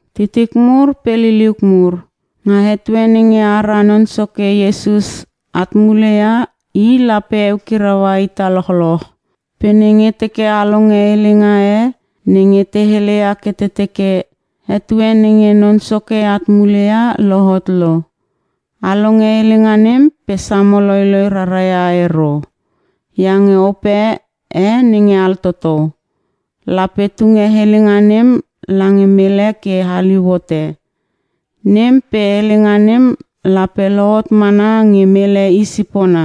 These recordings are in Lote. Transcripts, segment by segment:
Titik mur pe liliuk mur, nga etue nenge ara Non Soke Iesus at mule ia I lape eukiraua ita lochloch. Pe nenge teke a longe helenga e nge te heleia ke te teke, “Etue nenge Non Soke at mule ia lohot lo.” A longe helenga nem pe samo loiloi rara ia ero. Iange ope e nge altoto, lape tunge helenga nem lange mele ke haliu hote. Nem pe helenga nem lape lohot mana nge mele i sipona.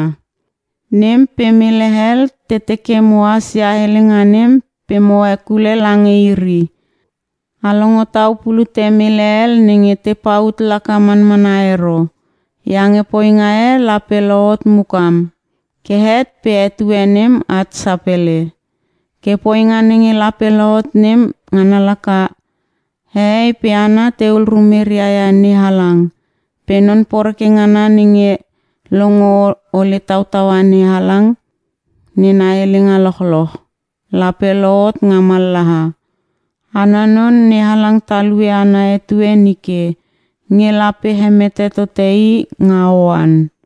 Nem pe mele hel te teke mohas ia helenga nem pe mo hekule lange iri. A longo tau pulute mele hel nenge te paut laka manmana ero, iange poinga e lape lohot mukam, ke het pe etue nem at sapele. Ke poinga nenge lape lohot nem ngana laka: Hehei pe hana tehul rumeria ia NeHalang, pe non poreke ngana nenge longo ole tautaua NeHalang nena helenga lochloch, lape lohot nga mallaha. Ana non, NeHalang talue ana etue nike nge lape hemete tote i nga oan.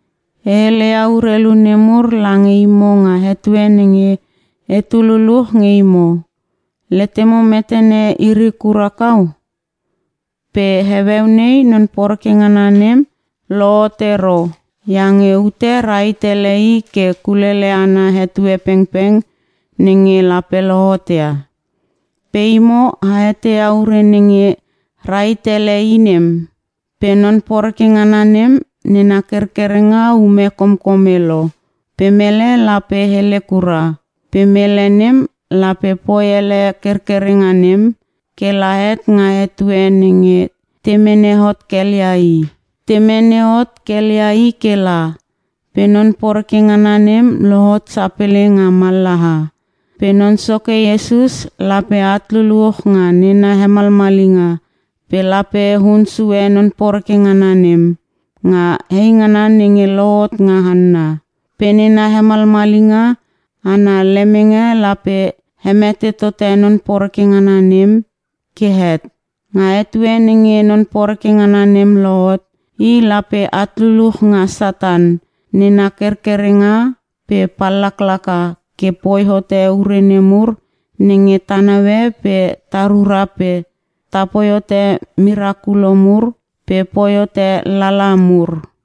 E heleia urelu nemur lange imo nga etue nenge etu luluch nge imo. Letemo metene iri kura kau? Pe heueu nei non poreke ngana nem lohot ero iange ute rahit ele i ke kulele ana etue pengpeng nenge lape lohot ia. Pe imo a eteia ure nenge rahit ele i nem. Pe non poreke ngana nem nena kerkerenga ume komkome lo pe mele la poi elele kura. Pe mele nem lape poi elele kerkerenga nem ke la het nga etue nenge te mene hot kelia i. Te mene hot kelia i ke la, pe non poreke ngana nem lohot sapele nga mallaha. Pe Non Soke Iesus lape at luluch nga nena hemalmalinga pe lape hun sue non poreke ngana nem nga eingana nenge lohot nga hanna. Pe nena hemalmalinga ana lemenge lape hemete tote non poreke ngana nem ke het. Nga etue nenge non poreke ngana nem lohot, i lape at luluch nga Satan nena kerkerenga pe pallaka ke poi hote ure nemur nenge ta naue pe ta rura pe poi hote merakulo mur pe poi hote lala mur.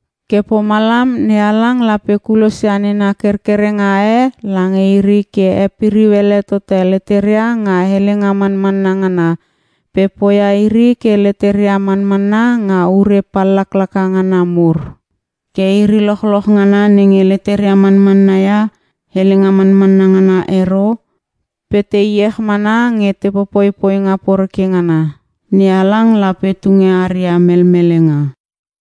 Ke pomalam NeHalang lape kulosia nena kerkerenga e lange iri ke hepiriu ele tote leteria nga helenga manmanna ngana pe poia iri ke leteria manmanna nga ure pallaklaka ngana mur. Ke iri lochloch ngana nenge leteria manmanna ia helenga manmanna ngana ero, pe te iech mana nge te popoi poinga poreke ngana, NeHalang lape tunge aria melmelenga.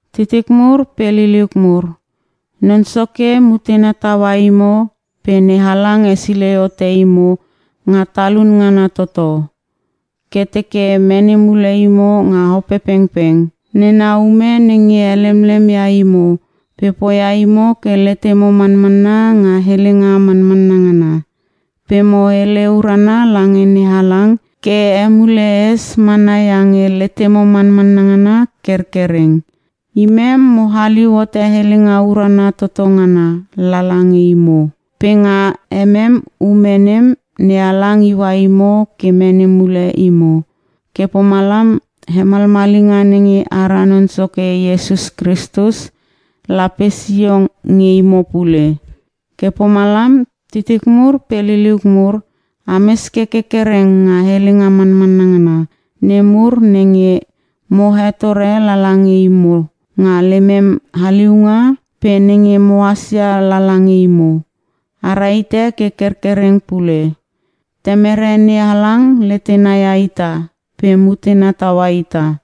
Titik mur pe liliuk mur, Non Soke mutena taua imo pe NeHalang hesilei hote imo nga talun ngana toto, ke teke mene mule imo nga Opepengpeng nena ume nenge helemlem ia imo pe poia imo ke letemo manmanna nga helenga manmanna ngana. Pe mo hele urana lange NeHalang ke emule es mana iange letemo manmanna ngana kerkereng. Imem mo haliu hote helenga urana toto ngana lala nge imo. Pe nga emem ume nem, NeHalang iua imo ke mene mule imo. Ke pomalam hemalmalinga nenge ara Non Soke Iesus Kristus lape sio nge imo pule. Ke pomalam titik mur pe liliuk mur, ames ke kerkereng nga helenga manmanna ngana nemur nenge mo hetore lala nge imo nga lemem haliunga, pe nenge mohas ia lala nge imo, a rahite ke kerkereng pule. Temere NeHalang letena ia ita pe mutena taua ita.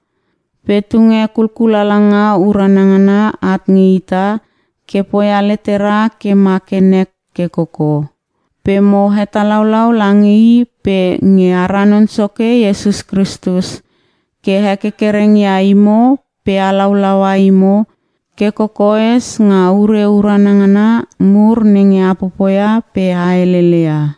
Pe tunge kulkulalanga urana ngana at nge ita ke poia letera ke ma ke nek ke koko. Pe mo hetalaulau lange i pe nge ara Non Soke Iesus Kristus ke hekerkereng ia imo pe halaulaua imo ke kokoes nga ure urana ngana mur nenge a popoia pe a helele ia.